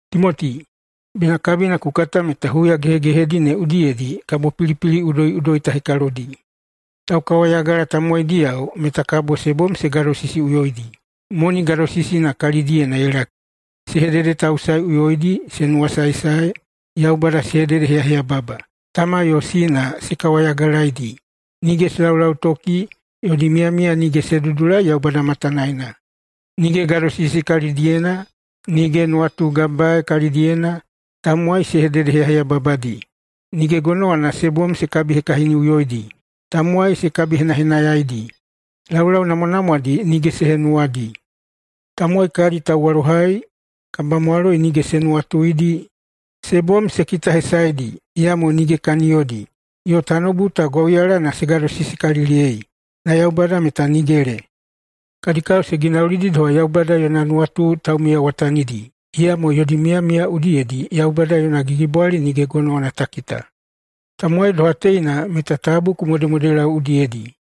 Timoti, bena kabina ku kata meta huya gehegehedi ne udiyedi kabo pilipili udoiꞌudoi ta hekalodi. Taukawayagala tamowaidiyao meta kabo se bom se gadosisiꞌuyoidi, moni gadosisina kalidiyena ye laki, se hededetausaeꞌuyoidi, se nuwasaesae, Yaubada se hededeheyaheyababa, tama yo sina se kawayagalaedi, nige se laulautoki, yodi miyamiya nige se dudulai Yaubada matanaena, nige gadosisi kalidiyena, nige nuwatugabae kalidiyena, tamowai se hededeheyaheyababadi, nige gonowana se bom se kabihekahiniꞌuyoidi, tamowai se kabihenahenayaidi, laulau namwanamwadi nige se henuwadi, tamowai kadi tauwalohai, kabamwaloi nige se nuwatuidi, se bom se kitahesaedi, iyamo nige kaniyodi, yo tanoubu ta gwauyalana se gadosisikaliliyei, na Yaubada meta nigele. Kadi kao se ginaulidi doha Yaubada yona nuwatu taumiyawatanidi, iyamo yodi miyamiya udiyedi Yaubada yona gigibwali nige gonowana ta kita. Tamowai doha teina meta tabu ku modemodelau udiyedi.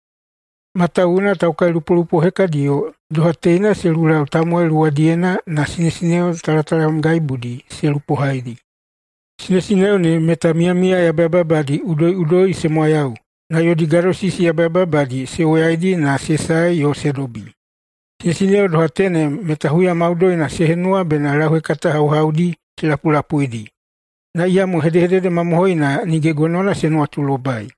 Matawuwuna taukailupolupo hekadiyo doha teina se lulau tamowai luwadiyena na sinesineo talatalamgaibudi se lupohaidi. Sinesineo ne meta miyamiya yabayababadi udoiꞌudoi se mwayau na yodi gadosisi yabayababadi se woyaidi na se sae yo se dobi. Sinesineo doha tenem meta huya maudoina se henuwa bena lauhekata hauhaudi se lapulapuidi, na iyamo hedehedede mamohoina nige gonowana se nuwatulobai.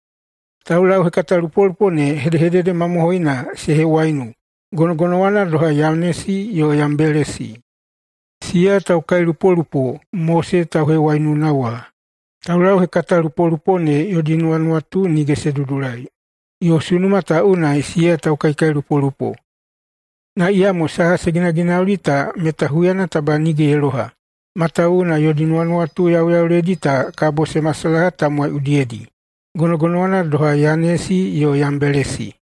Taulauhekatalupolupo ne hedehedede mamohoina se hewaiunu gonogonowana doha Yanesi yo Yambelesi, siya taukailupolupo Mose tauhewaiununa wa. Taulauhekatalupolupo ne yodi nuwanuwatu nige se dudulai, yo sunuma ta unai siya taukaikailupolupo. Na iyamo saha se ginaginauli ta meta huyana taba nige ye loha, matawuwuna yodi nuwanuwatu yauyauledi ta kabo se masalaha tamowai udiyedi, gonogonowana doha Yanesi yo Yambelesi.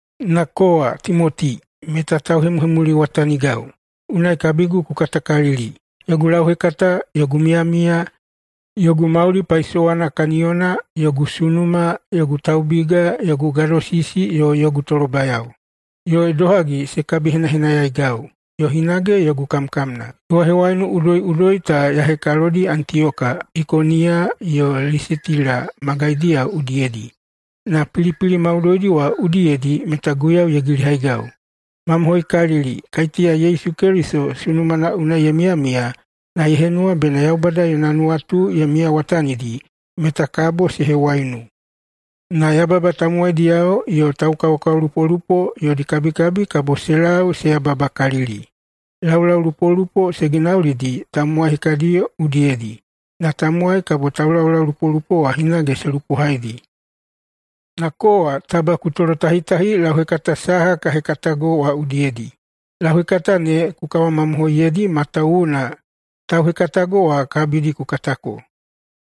Na kowa, Timoti, meta tauhemuhemuliwatanigau, unai kabigu ku katakalili, yogu lauhekata, yogu miyamiya, yogu mauli paisowana kaniyona, yogu sunuma, yogu taubiga, yogu gadosisi yo yogu tolobayao, yo idohagi se kabihenahenayaigau, yo hinage yogu kamkamna. Hewahewaiunu udoiꞌudoi ta ya hekalodi Antiyoka, Ikoniya yo Lisitila magaidiyao udiyedi, na pilipili maudoidi wa udiyedi meta Guiyau ye gilihaigau. Mamohoikalili, kaiteya Yesu Keliso sunumana unai ye miyamiya na ye henuwa bena Yaubada yona nuwatu ye miyawatanidi meta kabo se hewaiunu. Na yababa tamowaidiyao yo taukaokaolupolupo yodi kabikabi kabo se lau se yababakalili. Laulaulupolupo se ginaulidi tamowai hekadi udiyedi, na tamowai kabo taulaulupolupo wa hinage se lupohaidi. Na kowa taba ku tolotahitahi lauhekata saha ka hekatago wa udiyedi. Lauhekata ne ku kawamamohoiyeidi matawuwuna tauhekatago wa kabidi ku katako.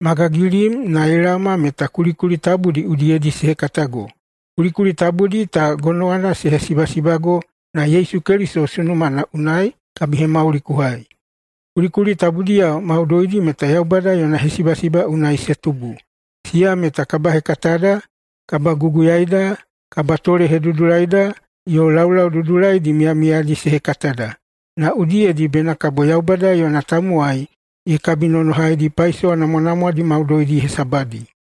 Ma gagilim na ye laoma meta kulikuli tabudi udiyedi se hekatago. Kulikuli tabudi ta gonowana se hesibasibago na Yesu Keliso sunumana unai kabihemauli ku hai. Kulikuli tabudiyao maudoidi meta Yaubada yona hesibasiba unai se tubu. Siya meta kabahekatada, kabaguguyaida, kabatolehedudulaida, yo laulau dudulaidi miyamiyaidi se hekatada, na udiyedi bena kabo Yaubada yona tamowai ye kabinonohaidi paisowa namwanamwadi maudoidi hesabadi.